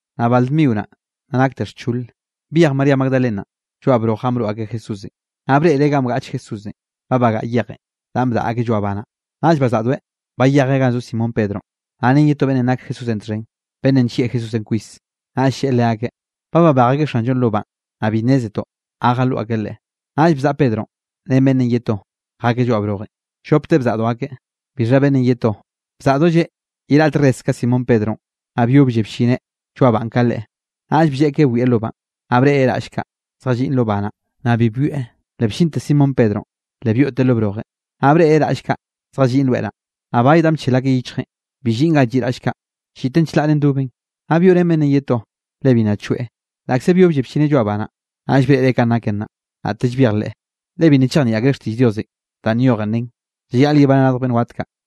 Naꞌ bal dmio naꞌ, nna nakte xchole, byej María Magdalena lloaꞌ broj ganꞌ broꞌ akeꞌ Jesúsenꞌ. Naꞌ breꞌreꞌ ganꞌ bgaꞌch Jesúsenꞌ, ba bagaꞌa yejenꞌ danꞌ bdaꞌa akeꞌ lloaꞌ ba naꞌ. Naꞌll bazaꞌdoeꞌ bayejeꞌ ganꞌ zo Simón Pedronꞌ, naꞌ ren ye to beꞌnn nak Jesúsenꞌ txhen, beꞌnnenꞌ nllieꞌ Jesúsenꞌ kwis, naꞌll lleꞌe leakeꞌ: —Ba babej akeꞌ Xanllonꞌ lo banꞌ, naꞌ bi nnézetoꞌ ga jaloꞌ akeꞌ Leꞌe. Naꞌll bzaꞌa Pedronꞌ ren beꞌnnenꞌ ye to, jakeꞌ lloaꞌ brojenꞌ. Llopteꞌ bzaꞌdo akeꞌ, bixha beꞌnnenꞌ ye to bzaꞌdolleꞌ ye raꞌte res ka Simón Pedronꞌ, naꞌ byoblleꞌ bllineꞌ lloaꞌ banꞌ ka leꞌe. Naꞌll blleꞌkeꞌ bwieꞌ lo banꞌ, naꞌ breꞌreꞌ raꞌll kaꞌ, zjalliꞌn lo ba naꞌ, naꞌ bi byoeꞌ. Le bllinte Simón Pedronꞌ, le byoꞌteꞌ lo brojenꞌ, naꞌ breꞌreꞌ raꞌll kaꞌ zjalliꞌn loe naꞌ. Naꞌ bay danꞌ bchel akeꞌ yichjeꞌn, bi lliꞌn ganꞌ lliꞌ raꞌll kaꞌ, lliꞌten chlaꞌre ndoben. Naꞌ byoꞌrén beꞌnnenꞌ ye to, le bi nna choeꞌ, laꞌkze byoblleꞌ bllineꞌ lloaꞌ ba naꞌ. Naꞌll breꞌreꞌ kanꞌ naken naꞌ, naꞌtelle byejleꞌe. Le bi nna chejnieꞌ akreꞌ xtiꞌll Diosenꞌ danꞌ nyoj nen, llayaꞌleꞌ yebaneꞌ radj beꞌnn wat kaꞌ.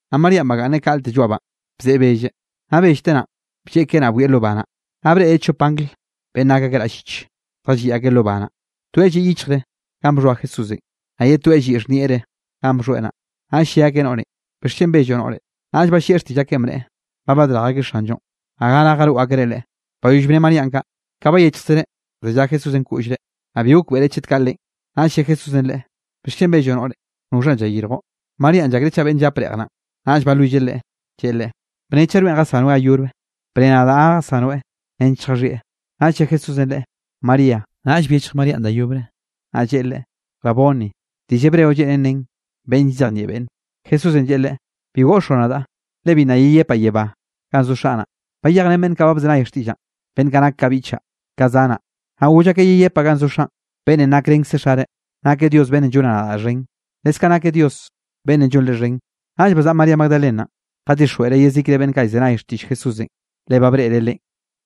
Naꞌ Maríanꞌ bagaꞌnneꞌ kaꞌlte lloaꞌ banꞌ, bzeꞌe belleꞌ. Nna bellteꞌ naꞌn, blleꞌkeꞌ naꞌ bwieꞌ lo ba naꞌ. Naꞌ breꞌreꞌ chop angl beꞌnn nak akeꞌ raꞌll lliche, zjalliꞌ akeꞌ lo ba naꞌ, toeꞌ lliꞌ yichjre ganꞌ bxhoa Jesúsenꞌ, naꞌ ye toeꞌ lliꞌ xhnieꞌre ganꞌ bxhoeꞌ naꞌ. Naꞌll lle akeꞌ noꞌrenꞌ: —¿Bixchen belloꞌ noꞌre? Naꞌll ballieꞌ xtiꞌll akeꞌn, bneꞌe: —Ba badrej akeꞌ Xanllonꞌ, naꞌ gara jaroꞌ akreꞌ Leꞌe. Bayoll bne Maríanꞌ kaꞌ, ka bayechjkzereꞌ zellá Jesúsenꞌ koꞌllre; naꞌ bi gokbeꞌreꞌ chet kaꞌ Leꞌen. Naꞌll lle Jesúsenꞌ leꞌe: —¿Bixchen belloꞌ noꞌre? ¿Noxhanꞌ llayirjoꞌ? Maríanꞌ llakreꞌ chaꞌ beꞌnne llap reꞌj naꞌn, naꞌll balwilleꞌ leꞌe, lleꞌe Leꞌe: —Bne, chaꞌ rweꞌn jasanoeꞌ ga yobre, bne nadaꞌ ga jasanoeꞌ nench lljaxhieꞌ. Naꞌll lle Jesúsenꞌ leꞌe: —¡María! Naꞌll byechj Maríanꞌ da yobre, naꞌ lleꞌe Leꞌe: —¡Raboni! —diꞌll hebreo lleꞌnen nen beꞌnn llzejnieꞌ beꞌnne. Jesúsenꞌ lleꞌe leꞌe: —Bi goꞌxoꞌ nadaꞌ, le bi nna yeyepaꞌ yebá ganꞌ zo Xaꞌ naꞌ. Bayejrén beꞌnn kaꞌ ba bzenay xtiꞌllaꞌn, beꞌnn kaꞌ nak ka biꞌchaꞌ, ka zanaꞌ, naꞌ goll akeꞌ yeyepaꞌ ganꞌ zo Xaꞌn, beꞌnnenꞌ nakrenkze Xare. Nakeꞌ Dios beꞌnnenꞌ llonaꞌ nadaꞌ xhen, leskaꞌ nakeꞌ Dios beꞌnnenꞌ llonre xhen. Naꞌll bazaꞌa María Magdalenanꞌ, jadixjweꞌreꞌ yezikre beꞌnn kaꞌ llzenay xtiꞌll Jesúsenꞌ, le ba breꞌreꞌ Leꞌen.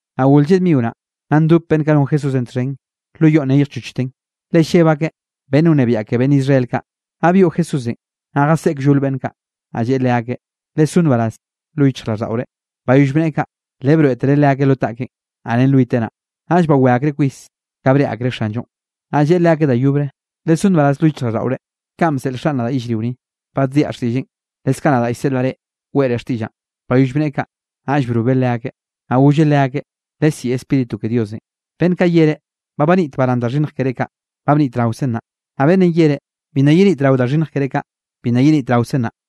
Naꞌ gol lleꞌ dmio naꞌ, nna ndop beꞌnn kaꞌ non Jesúsenꞌ txhen lo yoꞌn neyjchochten, le lleb akeꞌ beꞌnn wnebiaꞌ ke beꞌnn Israel kaꞌ. Naꞌ byoꞌ Jesúsenꞌ, naꞌ jaseꞌe kllol beꞌnn kaꞌ, naꞌ lleꞌe leakeꞌ: —Lesó nbaraz lo yichjraꞌlldaꞌore. Bayoll bneꞌe kaꞌ, le broeꞌtereꞌ leakeꞌ lo taꞌkeꞌn, naꞌ ren lwiteꞌ naꞌ. Naꞌll bawé akreꞌ kwis, ka breꞌe akreꞌ Xanllonꞌ. Naꞌ lleꞌe leakeꞌ da yobre: —Lesó nbaraz lo yichjraꞌlldaꞌore. Kanꞌ bseꞌl Xaꞌn nadaꞌ yellrio ni, baddiaꞌ xtiꞌlleꞌn, leskaꞌ nadaꞌ llseꞌlaꞌ reꞌ weꞌre xtiꞌllaꞌn. Bayoll bneꞌe kaꞌ, naꞌll brobeꞌ leakeꞌ, naꞌ golleꞌ leakeꞌ: —Lesiꞌi Spíritu ke Diosenꞌ. Beꞌnn kaꞌ yereꞌ: “Ba banit barán da xhinnj keré kaꞌ”, ba bnitraokzen naꞌ, naꞌ beꞌnn yereꞌ: “Bi nna yenitrao da xhinnj keré kaꞌ”, bi nna yenitraokzen naꞌ.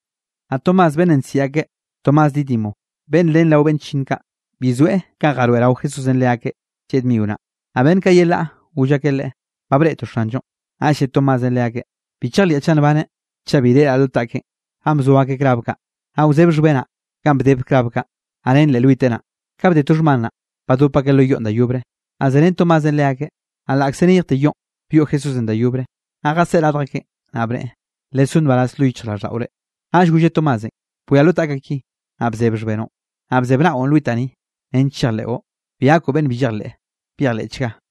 Naꞌ Tomás beꞌnnenꞌ bsiꞌi akeꞌ Tomás Dídimo, beꞌnn ren rao beꞌnn chllinn kaꞌ, bi zoeꞌ kanꞌ jaroeꞌrao Jesúsenꞌ leakeꞌ lleꞌ dmio naꞌ. Naꞌ beꞌnn kaꞌ yelaꞌ goll akeꞌ leꞌe: —Ba breꞌtoꞌ Xanllonꞌ. Naꞌll lle Tomásenꞌ leakeꞌ: —Bi chejliaꞌ chaꞌ nbaneꞌ, chaꞌ bi reꞌraꞌ lo taꞌkeꞌn ganꞌ bzo akeꞌ klav kaꞌ, naꞌ wzeb xhbenaꞌ ganꞌ bdeb klav kaꞌ, naꞌ ren leꞌ lwiteꞌ naꞌ. Ka bde to xhman naꞌ, badop akeꞌ lo yoꞌn da yobre, naꞌ zerén Tomásenꞌ leakeꞌ. Naꞌ laꞌkze neyjte yoꞌn, byoꞌ Jesúsenꞌ da yobre, naꞌ jaseꞌe radj akeꞌn, naꞌ bneꞌe: —Lesó nbaraz lo yichjraꞌlldaꞌore. Naꞌll golleꞌ Tomásenꞌ: —Bwia lo taꞌkaꞌ ki, naꞌ bzeb xhbenoꞌn. Naꞌ bzeb naꞌon lwitaꞌ ni, nench chejleꞌo. Bi gakoꞌ beꞌnn bi llejleꞌ, byejleꞌchga.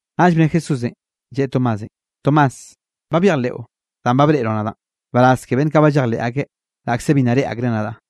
Naꞌll bne Jesúsenꞌ, lleꞌe Tomásenꞌ: —Tomás, ba byejleꞌo danꞌ ba breꞌroꞌ nadaꞌn. Nbaraz ke beꞌnn kaꞌ ba llejleꞌ akeꞌ, laꞌkze bi nna reꞌe akreꞌ nadaꞌ.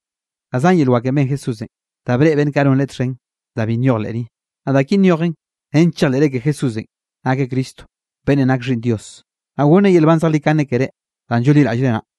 Da zan yel wakenꞌ ben Jesúsenꞌ, da breꞌe beꞌnn kaꞌ non Leꞌe txhen, da bi nyoj leꞌ ni. Naꞌ da ki nyojen nench chejleꞌre ke Jesúsenꞌ nakeꞌ Cristo, beꞌnnenꞌ nak Xhiꞌnn Dios, naꞌ gonneꞌ yel nban zejlikane keré danꞌ llonliraꞌllreꞌ naꞌ.